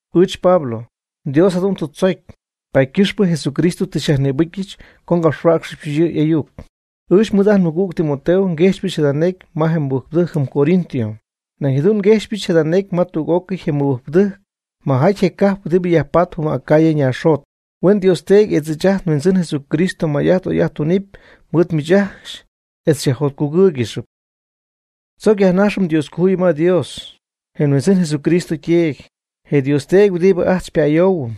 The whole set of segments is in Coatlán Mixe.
Ɨɨch Pablo, Dios jadu'n tɨ tzocy, paady ycɨxpɨ Jesucristo tɨ xyajnïbɨcyɨch co ngapxhuäcxɨbɨch yɨ' y'ayuc. Ɨɨch mɨɨd ajt nmɨgüg Timoteo nguejxypɨch jada necy ma je mɨbɨjcpɨdɨjc jɨm Corinto. Nañ jadu'n nguejxypɨch jada necy ma tüg'ócɨy je mɨbɨjcpɨdɨjc majaty je cajp huɨdibɨ yajpatp jɨm Acaya ñaaxjot. Huen Dios Teedy etz ɨɨch ajt nHuindzɨn Jesucristo may'ajt oy'ajt tunɨpy mɨɨd miich ajcxy etz xyajjotcugɨ́ɨygɨxɨp. Tzoc yajnajxɨm Dioscojuyip ma Dios, je nHuindzɨn Jesucristo yTeedy, je Dios Teedy huɨdibɨ ajt xypa'ayoohuɨm,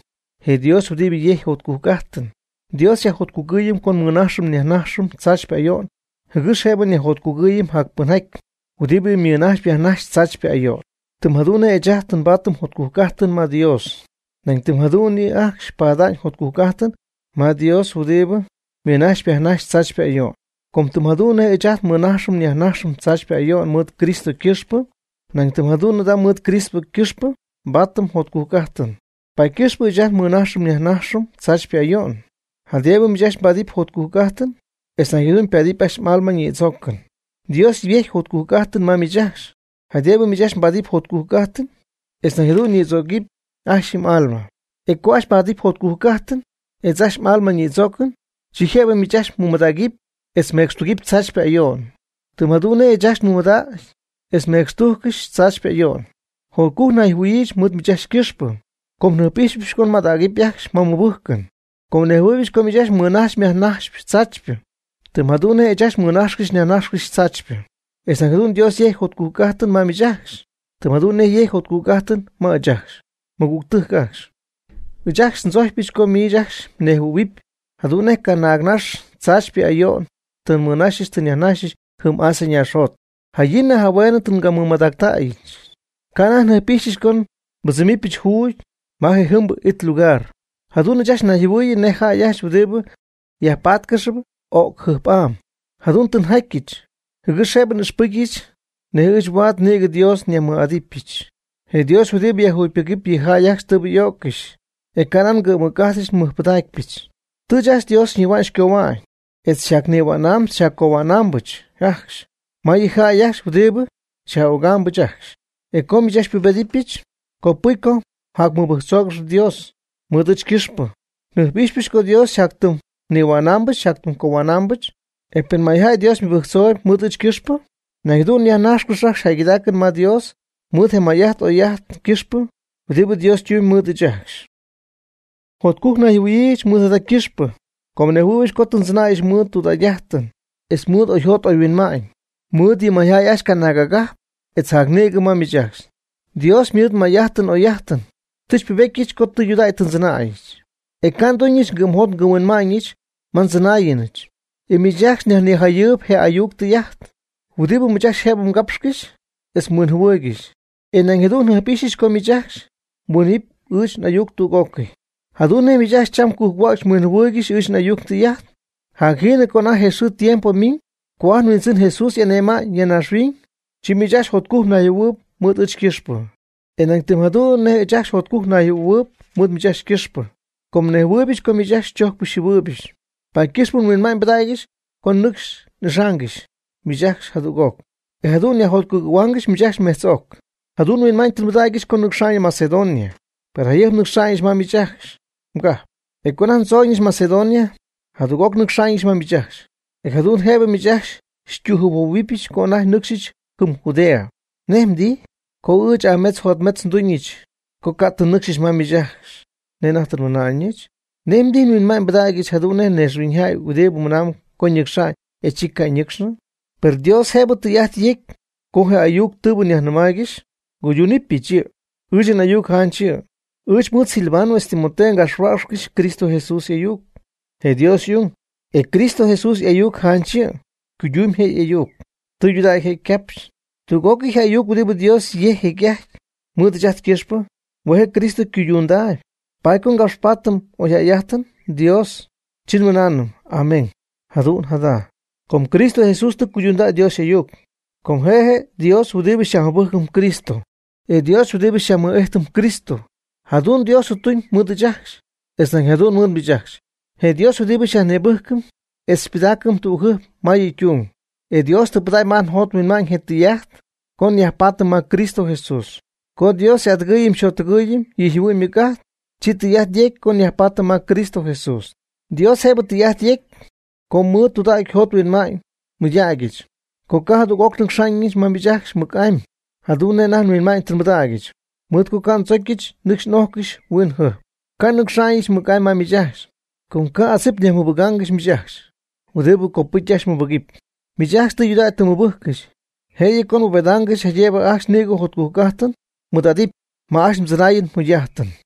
je Dios huɨdibɨ yejcp jotcujc'ajtɨn. Dios xyajjotcugɨɨyɨm co nmɨnajxɨm nyajnajxɨm tzaachypɨ ayo'n jɨgɨx jëbɨ nyajjotcugɨɨyɨm jacpɨnjaty huɨdibɨ mɨnajxp yajnajxp tzaachypɨ ayo'n. Tɨm jadu'n nej ɨɨch ajcxy tɨ nbaady jotcujc'ajtɨn ma Dios, nañ tɨm jadu'n yɨ' ajcxy pada'ñ jotcujc'ajtɨn ma Dios huɨdibɨ mɨnajxp yajnajxp tzaachypɨ ayo'n. Com tɨm jadu'n nej ɨɨch ajt nmɨnajxɨm nyajnajxɨm tzaachypɨ ayo'n mɨɨd Cristo ycɨxpɨ, nañ tɨm jadu'n mɨɨd Cristo ycɨxpɨ nbaatɨm jotcujc'ajtɨn. Paady ycɨxpɨ ɨɨch ajcxy nmɨnajxcɨxy nyajnajxcɨxy tzaachypɨ ayo'n, jaydëbɨ miich ajcxy mbaadɨp jotcujc'ajtɨn etz nañ jadu'n ypaadɨp ajcxy m'alma ñïdzoocɨn. Dios yejcpy jotcujc'ajtɨn ma miich ajcxy, jaydëbɨ miich ajcxy mbaadɨp jotcujc'ajtɨn etz nañ jadu'n ñïdzögɨp ajcxy yɨ m'alma. E co ajcxy mbaadɨp jotcujc'ajtɨn etz ajcxy m'alma nïdzoocɨn, chi jëbɨ miich ajcxy mmɨmadägɨp etz mmecxtugɨp tzaachypɨ ayo'n, tɨm jadu'n nej ɨɨch ajcxy nmɨmadägy etz nmecxtújccɨxɨch tzaachypɨ ayo'n. Jotcujc nayjɨhuɨ̈yiijɨch mɨɨd miich ajcxy ycɨxpɨ, com njɨjp'ijxpɨch co mmadägɨpy ajcxy ma mmɨbɨjcɨn. Com nejhuɨɨybɨch co miich ajcxy mmɨnajxyp myajnajxypɨ tzaachypɨ, tɨm jadu'n nej ɨɨch ajcxy nmɨnajxcɨxy nyajnajxcɨxy tzaachypɨ. E nañ jadu'n Dios yejcpy jotcujc'ajtɨn ma miich ajcxy, tɨm jadu'n nej yecy jotcujc'ajtɨn ma ɨɨch ajcxy. Mɨgügtɨjc ajcxy, ɨɨch ajcxy ndzojcypɨch co miich ajcxy mnejhuɨ̈huɨp jadu'n nej canaagnax tzaachypɨ ayo'n tɨ nmɨnaxyɨch tɨ nyajnaxyɨch jɨm Asia naaxjot. Jayin jahueenɨ tɨ ngamɨmadäga'ñɨch. Ca' anajty njɨjp'ixyɨch co nbɨdzɨmɨpyɨch juugy ma je jɨmbɨ it lugar. Jadu'n ɨɨch ajcxy nnayjɨhuɨ̈yii nej jäy ajcxy huɨdibɨ yajpatcɨxp o'cjɨjp'am. Jadu'n tɨ njatyɨch, jɨgɨx jëbɨ n'ixpɨcyɨch nej ɨɨch huaad nïgɨ Dios nyajmɨj'atyɨch, je Dios huɨdibɨ yajjugypɨgɨp yɨ jäy ajcxy tɨɨbɨ y'öccɨxy. E ca' nan ngɨ'm mɨc'ajt nmɨjpɨdaacpyɨch. Tɨ ɨɨch ajcxy Dios xyñihua'ñ xycohua'ñ, e xyjacnihua'naamb xyjaccohua'naambɨch ajcxy ma yɨ jäy ajcxy huɨdibɨ xyaj'ögaambɨch ajcxy. E co miich ajcxy xypubejtyɨch, copɨcy co jacmɨbɨjctzoogɨx Dios mɨɨd ɨɨch ycɨxpɨ. Njɨjp'ijxypɨch co Dios yɨ' xyjatyɨmy xyñihua'naambɨch xycohua'naambɨch. E pen mayjäy Dios mɨbɨjctzoogɨxy mɨɨd ɨɨch ycɨxpɨ, nañ jadu'n yajnájxcɨxyɨpy ajcxy jäygɨdaacɨn ma Dios mɨɨd je may'ajt oy'ajt ycɨxpɨ huɨdibɨ Dios ytumyb mɨɨd ɨɨch ajcxy. Jotcujc nayjɨhuɨ̈yiijɨch mɨɨd jada ycɨxpɨ com nejhuɨɨybɨch co tɨ ndzɨnäyɨch mɨɨd tudägy'ajtɨn etz mɨɨd oyjot oyhuinma'ñ mɨɨd yɨ mayjäy ajcxy canaag agajp etz jacnïgɨ ma miich ajcxy. Dios mɨɨd may'ajtɨn oy'ajtɨn tɨ xypubetyɨch co tudägy tɨ ndzɨnäyɨch, e ca' nguyduñɨch ngɨ'mjot ngɨ'mhuinma'ñɨch ma ndzɨnáayɨnɨch. Ɨɨch miich ajcxy nyajnijayɨɨyb je ayuc tɨy'ajt huɨdibɨ miich ajcxy jëbɨ mgapxcɨxy etz mhuinjɨhuɨɨygɨxy. E nañ jadu'n njɨjp'ijxypɨch co miich ajcxy mhuinjɨhuɨ̈huɨpy ɨɨch n'ayuc tüg'ócɨy. Jadu'n nej miich ajcxy cham cujc-huäcxy mhuinjɨhuɨɨygɨxy ɨɨch n'ayuc ndɨy'ajt. Jacjiinɨ co anajty je xɨɨ je tiempo ymiñ co ajt nHuindzɨn Jesús y'ane'ma'ñ ya naaxhuiñ, chi miich ajcxy jotcujc mnayjɨhuɨ̈huɨɨyb mɨɨd ɨɨch ycɨxpɨ. E nañ tɨm jadu'n nej ɨɨch ajcxy jotcujc nayjɨhuɨ̈huɨɨyb mɨɨd miich ajcxy ycɨxpɨ. Com nejhuɨɨybɨch co miich ajcxy xychojcpɨch xyjɨhuɨɨybɨch, paady ycɨxpɨ nhuinma'ñ nbɨdägyɨch co nɨcxy n'ixaangɨxy miich ajcxy jadüg'oc, e jadu'n nyajjotcugɨ̈huaangɨxɨch miich ajcxy mejtz'oc. Jadu'n nhuinma'ñ tɨ nbɨdägyɨch co nnɨcxa'ñɨch Macedonia. Per jayɨjp nnaxa'ñɨch ma miich ajcxy mgajp. E co anajty ndzooñɨch Macedonia, jadüg'oc nnɨcxa'ñɨch ma miich ajcxy. E jadu'n jëbɨ miich ajcxy xytüjɨjphuohuɨ̈huɨbɨch co anajty nnɨcxyɨch jɨm Judea. ¿Nej mdijy, co ɨɨch aametz jotmetz nduñɨch co ca' tɨ nnɨcxyɨch ma miich ajcxy nej anajty tɨ nmɨna'ñɨch? ¿Nej mdijy, nhuinma'ñ mɨɨdɨdyɨch jadu'n nej naaxhuiñyjäy huɨdibɨ mɨnamb co ñɨcxa'ñ, e chi ca' ñɨcxnɨ? Per Dios jëbɨ tɨy'ajt yegɨpy co je ayuc tɨɨbɨ nyajnɨmaaygɨxy, nguydunɨpyɨch yɨ'. Ɨɨch n'ayuc janch yɨ'. Ɨɨch mɨɨd Silvano etz Timoteo ngapxhuäcxcɨxyɨch Cristo Jesús y'ayuc, je Dios y'ung. E Cristo Jesús y'ayuc janch yɨ', ycuydumyb je' y'ayuc, tudägy je' ycapxy. Tüg'ócɨy je ayuc huɨdibɨ Dios yejc jecy'ajty mɨɨd ɨɨch ajt ycɨxpɨ, hue' Cristo Jesús cuydundaayb. Paady co ngapxpaatɨm n'ojadajtɨm Dios, chi nmɨnaanɨm. “Amén, jadu'n jada,” com Cristo Jesús tɨ cuydundäy Dios y'ayuc. Com je' je' Dios huɨdibɨ xyajmɨbɨjcɨm Cristo, e Dios huɨdibɨ xyajmɨɨd'ijtɨm Cristo. Jadu'n Dios ytuñ mɨɨd ɨɨch ajcxy etz nañ jadu'n mɨɨd miich ajcxy. Je' je' Dios huɨdibɨ xyajnïbɨjcɨm etz xypɨdaacɨm tügjɨjp ma yɨ' ytung. Dios tɨ pɨdägy ma ajt njot nhuinma'ñ je tɨy'ajt co nyajpaatɨm ma Cristo Jesús. Co Dios xy'adɨgɨɨyɨm xyjottɨgɨɨyɨm yɨ' yjɨhuɨ'ñ ymɨc'ajt, chi tɨy'ajt yecy co nyajpaatɨm ma Cristo Jesús. Dios jëbɨ tɨy'ajt yegɨpy co mɨɨd tudägy njot nhuinma'ñ nmɨydacyɨch co ca' jadüg'oc nnɨcxyñɨch ma miich ajcxy mɨc'amy, jadu'n nej anajty nhuinma'ñ tɨ nbɨdägyɨch, mɨɨd co ca' ndzocyɨch nɨcxy n'ojcɨxy huin jɨjp. Ca' nnɨcxa'ñɨch mɨc'amy ma miich ajcxy, com ca' adzip nyajmɨbɨgaangɨxy miich ajcxy huɨdibɨ copɨcy ajcxy mmɨbɨgɨpy. Miich ajcxy tɨydudägy tɨ mmɨbɨjccɨxy. Jëyɨ co nbubedaangɨxy jaydëbɨ ajcxy nïgɨ jotcujc'ajt mmɨɨd'adɨpy ma ajcxy mdzɨnaayɨn mjugy'ajtɨn.